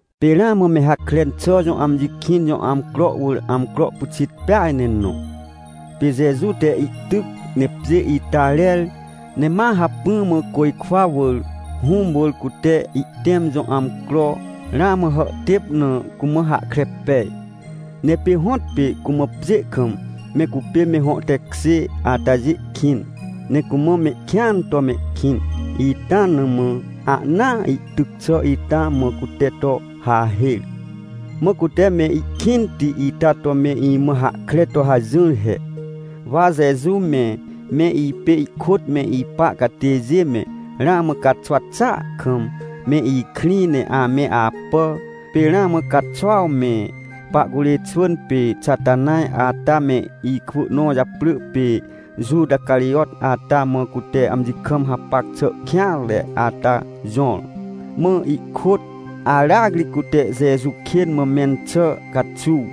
Pê ramã me Hakren xà jõ amji kĩn jõ amcro wỳr amcro pyxit peaj ne nõ. Pê Jeju te ihtyc, ne pjê ita rer, ne ma hacpỹ mã côjkwa wỳr, Hũm wỳr cute ihtẽm jõ amcro ramã hàhtêp na, cumã hahkre pej. Ne pê hõtpê cumã pjê kam me cupê me hõ tekjê atajê kĩn, ne cumã mehkĩan to mehkĩn ita na mã ahnaa ihtyc xà ita mã cute to hahêr. Mã cute me ikĩnti ita to me imã hahkre to hajỹr he. Wa Jeju me, me ipê ihkôt me ipa catêjê me, ramã caxwa xàa kam, me ikrĩ ne ame apà. Pê ramã caxuaw me pahcurê xwỳn pê Xatanaj ata me ikwỳ nõ japrỳ pê Juta Carijot ata mã, cute amji kam hapac xà kêanre ata jõr, mã ihkôt aracri cute Jeju kên mã mẽn xà caxuw.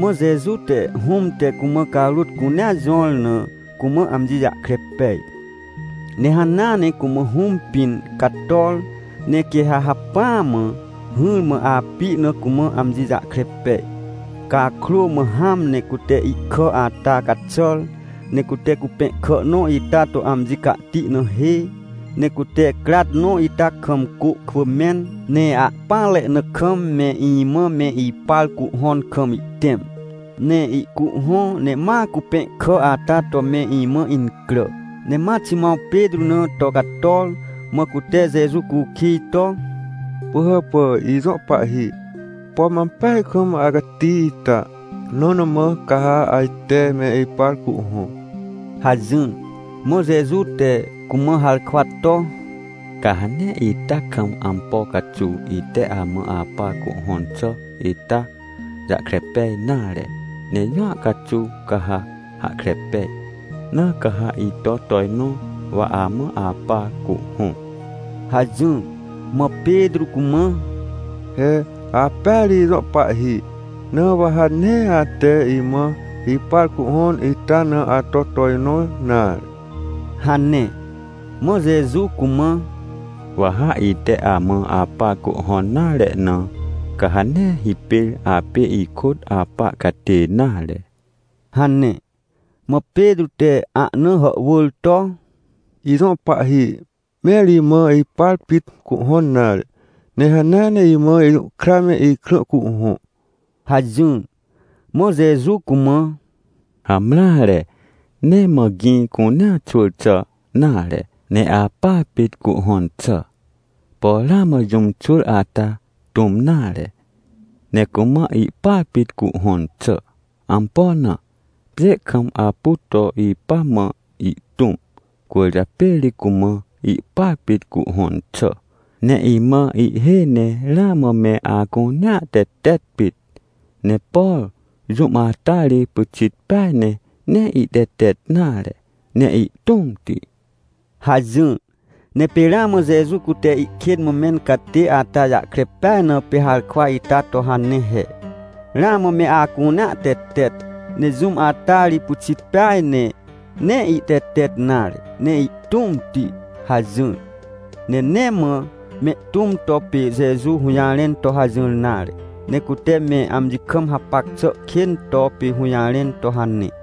Mã Jeju te, Hũm te cumã carôt cunea jõr na, cumã amji jahkre pej. Ne hanea ne cumã Hũm pĩn cator, ne quê ha hacpỹa mã hỹrmã api na, cumã amji jahkre pej. Cakrô mã hãm ne cute ihkà ata caxàr, ne cute cupẽhkà nõ ita to amji cahti na hê. Ne cute crat nõ ita kam cô kwỳ mẽn, ne ahpỹanre na kam me imã me ipar cuhhõn kam ihtẽm. Ne ihcuhhõ ne ma cupẽhkà ata to me imã incrà. Ne ma Ximãw Petrô na to cator, mã cute Jeju cukij to: — Pỳhàpà ijõ Pahhi, pom ampeaj kam acati ita, nõ na mã ca ha ajte me ipar cuhhõ? — hajỹr. Mã Jeju te cumã harkwa to: — Ca ha nee ita kam ampo caxuw ite amã apar cuhhõn xà ita jahkre pej nare, ne jũa caxuw ca ha hahkre pej. Na ca ha ito tojnõ wa amã apar cuhhõ — hajỹr. Mã Petrô cumã: — He apêa ri ijõ Pahhi, na wa ha nee ate imã ipar cuhhõn ita na ato tojnõ nare — hane. Mã Jeju cumã: — Wa ha ite amã apar cuhhõn nare na, ca ha nee hipêr apê ikôt apa catê nare — hane. Mã Petrô te ahna hàhwỳr to: — Ijõ Pahhi, mẽr imã ipar pit cuhhõn nare, ne hanea ne imã ijũhkra me ikrã cuhhõ! — hajỹr. Mã Jeju cumã: — Hamreare, nee mã gĩ cunea xwỳr xà nare, ne apar pit cuhhõn xà. Por ramã jũm xwỳr ata tũm nare, ne cumã ihpar pit cuhhõn xà. Ampo na? Pjê kam apu to ipa mã ihtũm, cwỳrjapê ri cumã ihpar pit cuhhõn xà. Ne imã ihhêj ne ramã me acunea tetet pit, ne por jũm ata ri pyxit peaj ne nee ihtetet nare ne ihtũmti — hajỹr. Ne pê ramã Jeju cute ihkên mã mẽn catê ata jahkre peaj, na pê harkwa ita to hane he: — Ramã me acunea tetet, ne jũm ata ri pyxit peaj, ne nee ihtetet nare ne ihtũmti — hajỹr. Ne nee mã mehtũm to pê Jeju hũjarẽn to hajỹr nare, ne cute me amji kam hapac xà kên to pê hũjarẽn to hane.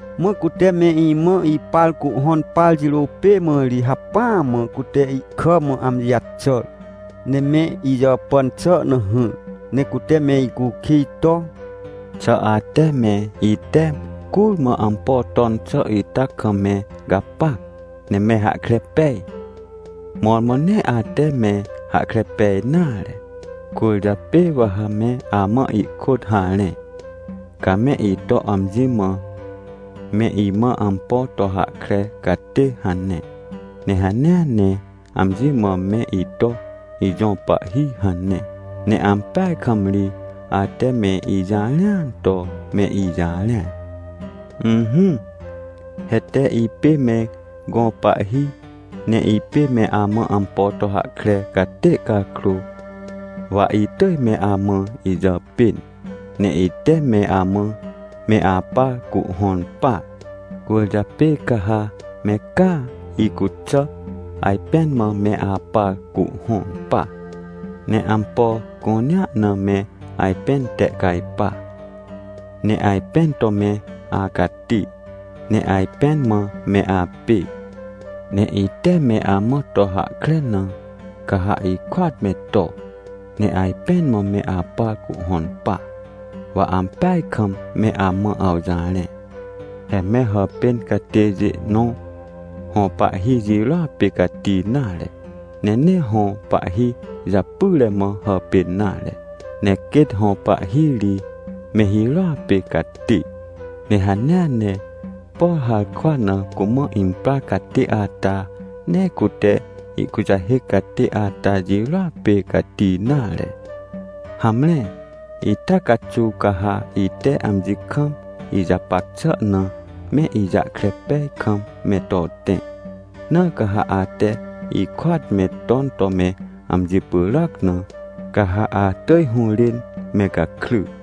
Mã cute me imã ipar cuhhõn par jirô pê mã ri hacpỹa mã cute ihkà mã amji jaxàr, ne me ijàpàn xà na hỹr, ne cute me icukij to: — Xà ate me ite curmã ampo ton xà ita kam me gapac, ne me hahkre pej? Mõrmõ nee ate me hahkre pej nare, cwỳrjapê wa ha me amã ihkôt harẽ. Ca me ito amji mã: “Me imã ampo to hahkre catê” hane. Ne hanea ne amji mã me ito: “Ijõ Pahhi” hane. Ne ampeaj kam ri ate me ijarẽan to me ijarẽan. Ỹhỹ, he tee ipê me gõ pahhi, ne ipê me amã ampo to hahkre catê cakrô, wa itỳj me amã ijàpên, ne ite me amã me apar cuhhõn par. Cwỳrjapê ca ha me caa icuxà ajpẽn mã me apar cuhhõn pa. Ne ampo cunea na me ajpẽn tehcajpa, ne ajpẽn to me acati, ne ajpẽn mã me apê. Ne ite me amã to hahkre na, ca ha ikôat me to, ne ajpẽn mã me apar cuhhõn pa. Wa ampeaj kam me amã awjarẽ, he me hàpên catêjê nõ hõ pahhi jirôa pê cati nare. Ne nee hõ pahhi japyre mã hàpên nare. Ne quêt hõ pahhi ri me hirôa pê cati. Ne hanea ne, por harkwa na cumã imprar catê ata, nee cute ihkujahêc catê ata jirôa pê cati nare. Hamre, ita caxuw ca ha ite amji kam ijapac xà na me ijahkre pej kam me to tẽ. Na ca ha ate ikôat me ton to me amji pyràc na, ca ha atỳj hũrên me gakry.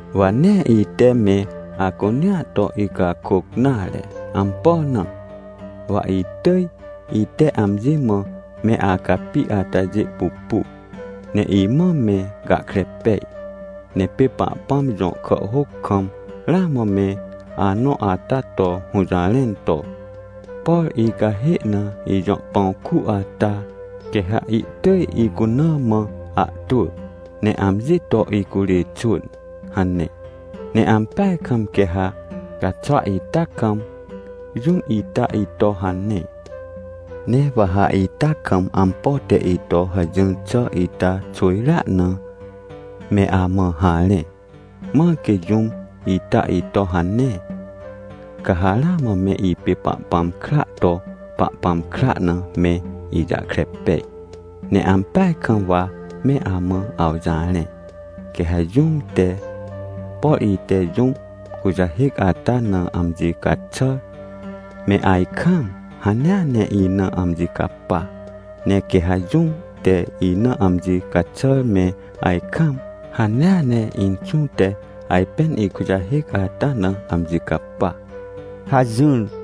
— Wa nee ite me acunea to icakôc nare. Ampo na? Wa itỳj ite amji mã me acapi atajê pupu, ne imã me gahkre pej. Ne pê Pahpãm jõ kàhhôc kam ramã me anõ ata to hũjarẽn to: “Por icahê na ijõ pãw ku ata, quê ha ihtỳj icuna mã ahtwỳ ne amji to icurê xwỳn” hane. Ne ampeaj kam quê ha caxwa ita kam, jũm ita ito hane. Ne wa ha ita kam ampo te ito hajỹr xà ita xwỳjrea na, me amã harẽ. Mãr quê jũm ita ito hane, ca ha ramã me ipê Pahpãm kraa to Pahpãm kra na me ijahkre pej. Ne ampeaj kam wa me amã awjarẽ, quê ha jũm te, por ite jũm kujahêc ata na amji caxàr me ajkaam, hanea ne ina amji capa. Ne quê ha jũm te ina amji caxàr me ajkaam, hanea ne Inxũ te ajpên ikujahêc ata na amji capa — hajỹr.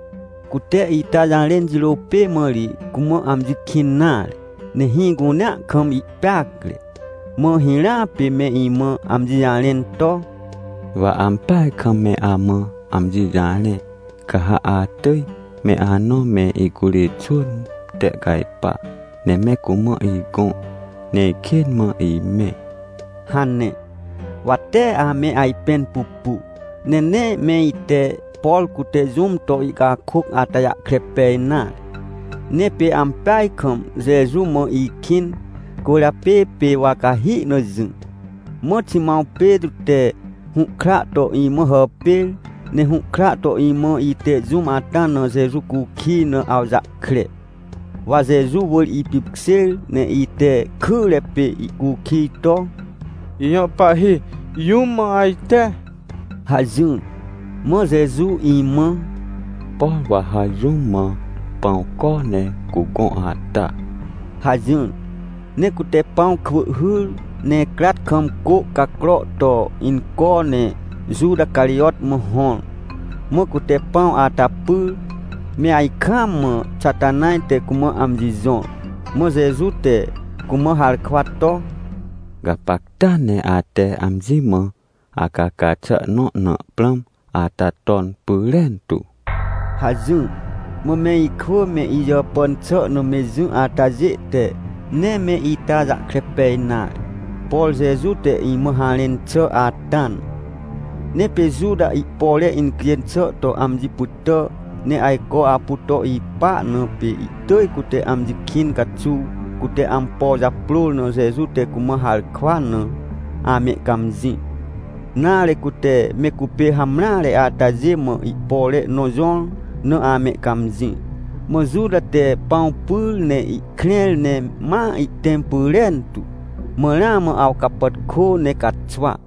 Cute ita jarẽn jirô pê mã ri cumã amji kĩn nare, ne hĩ cunea kam ihpeacre. Mã hirãa pê me imã amji jarẽn to: — Wa ampeaj kam me amã amji jarẽ, ca ha atỳj me anõ me icurê xwỳn tehcajpa ne me cumã igõ, neikên mã imẽ — hane. Wa tee ame ajpẽn pupu, ne nee me ite, por cute jũm to ihcakôc ata jahkre pej nare. Ne pê ampeaj kam Jeju mã ikĩn, cwỳrjapê pê wa cahi na jỹ. Mã Ximãw Petrô te hũhkra to imã hàpêr, ne hũhkra to imã, ite jũm ata na Jeju cukij na awjahkre. Wa Jeju wỳr ipipkjêr ne ite kyre pê ihcukij to: — Ijõ Pahhi, jũm mã ajte? — hajỹr. Mã Jeju imã: — Por wa ha jũm mã pãw co ne cugõ ata — hajỹr. Ne cute pãw kwỳ hyr ne crat kam cô cacro to inco, ne Juta Carijot mã hõr. Mã cute pãw ata pyr me ajkaam mã Xatanaj te cumã amji jõr. Mã Jeju te cumã harkwa to: — Gapacta ne ate amji mã acaca xà nõ na prãm ata ton pyrentu — hajỹr. Mã me ikwỳ me ijàpàn xà na me jỹ atajê te nee me ita jahkre pej nare, por Jeju te imã harẽn xà ata na. Ne pê Juta ihpore incjên xà to amji pytà, ne ajco apu to ipa na, pê ihtỳj cute amji kĩn caxuw cute ampo japrôr na Jeju te cumã harkwa na amehcãmjĩ, nare, cute me cupê hamreare atajê mã ihpore nõ jõr na amehcãmjĩ. Mã Juta te pãw pyr, ne ihkrẽr ne ma ihtẽm pyrentu. Mã ramã awcapàtkô ne caxwa.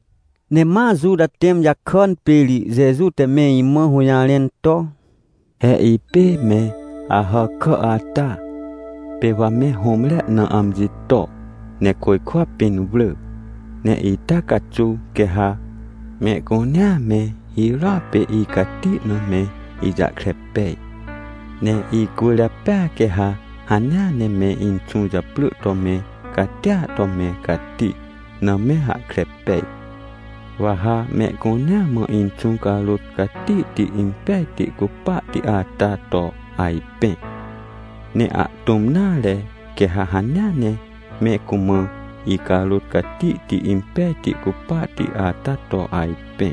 Ne ma Juta tẽm jakàn pê ri Jeju te me imã hũjarẽn to: — He ipê me Ahàkà ata pê wa me hũmre na amji to, ne côjkwa pĩn wrỳ. Ne ita caxuw quê ha mehcunea me hirôa pê icati na me ijahkre pej. Ne icwỳrjapêa quê ha hanea ne me Inxũ japrỳ to me catia to me cati na me hahkre pej. Wa ha mehcunea mã Inxũ carôt catihti impejti cupahti ata to ajpẽ, ne ahtũm nare, quê ha hanea ne me cumã icarôt catihti impejti cupahti ata to ajpẽ.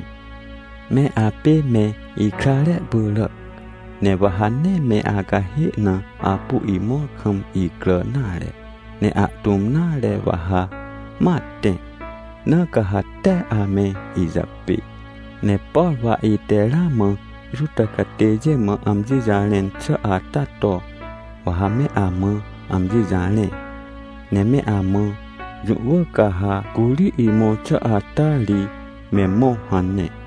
Me apê me ikrare pyràac. Ne wa ha nee me acahê na apu imõr kam icrà nare, ne ahtũm nare wa ha ma tẽ. Na ca ha tee ame ijapê. Ne por wa ite ramã Juta catêjê mã amji jarẽn xà ata to, wa ha me amã amji jarẽ, ne me amã: “Jũ wỳr ca ha curi imõr xà ata ri me mõ” hane.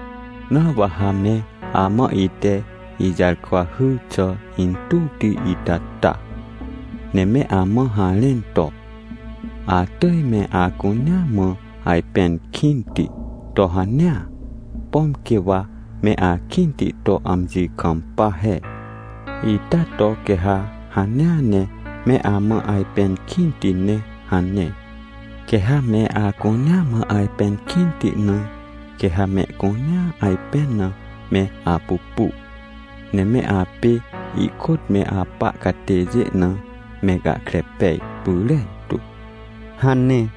— Na wa ha me amã ite ijarkwa hyr xà intuwti ita ta, ne me amã harẽn to: “Atỳj me acunea mã ajpẽn kĩnti, to hanea, pom quê wa me akĩnti to amji kampa he, ita to quê ha hanea ne me amã ajpẽn kĩnti ne” hane. Quê ha me acunea mã ajpẽn kĩnti na, quê ha mehcunea ajpẽn na me apupu, ne me apê ikôt me apa catêjê na me gahkre pej pyrentu — hane.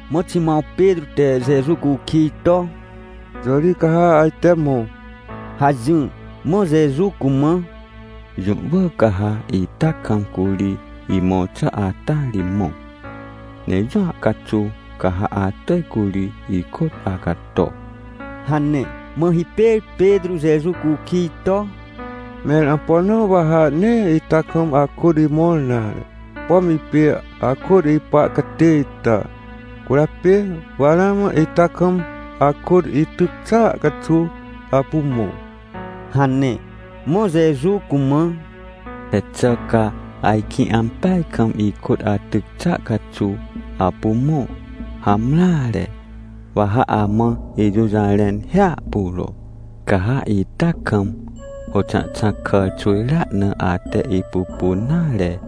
Mã Ximãw Petrô te Jeju cukij to: — Jõ ri ca ha ajte mõ? — hajỹr. Mã Jeju cumã: — Jũ wỳr ca ha ita kam curi imõr xà ata ri mõ, ne jũa caxuw ca ha atỳj curi ikôt acato — hane. Mã hipêr Petrô Jeju cukij to: — Mẽr ampo na wa ha nee ita kam akôt imõr nare? Pom ipê akôt ipa catê ita, cwỳrjapê wa ramã ita kam akôt ityc xàa caxuw apu mõ — hane. Mã Jeju cumã: — He xà ca ajkĩ ampeaj kam ikôt atyc xàa caxuw apu mõ? Hamreare. Wa ha amã ijũjarẽn hiahpuro. Ca ha ita kam, hôxãhxãc kàr xwỳjrea na, ate ipupun nare,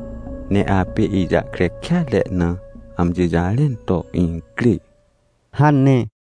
ne apê ijahkre kêatre na, amji jarẽn to incrê — hane.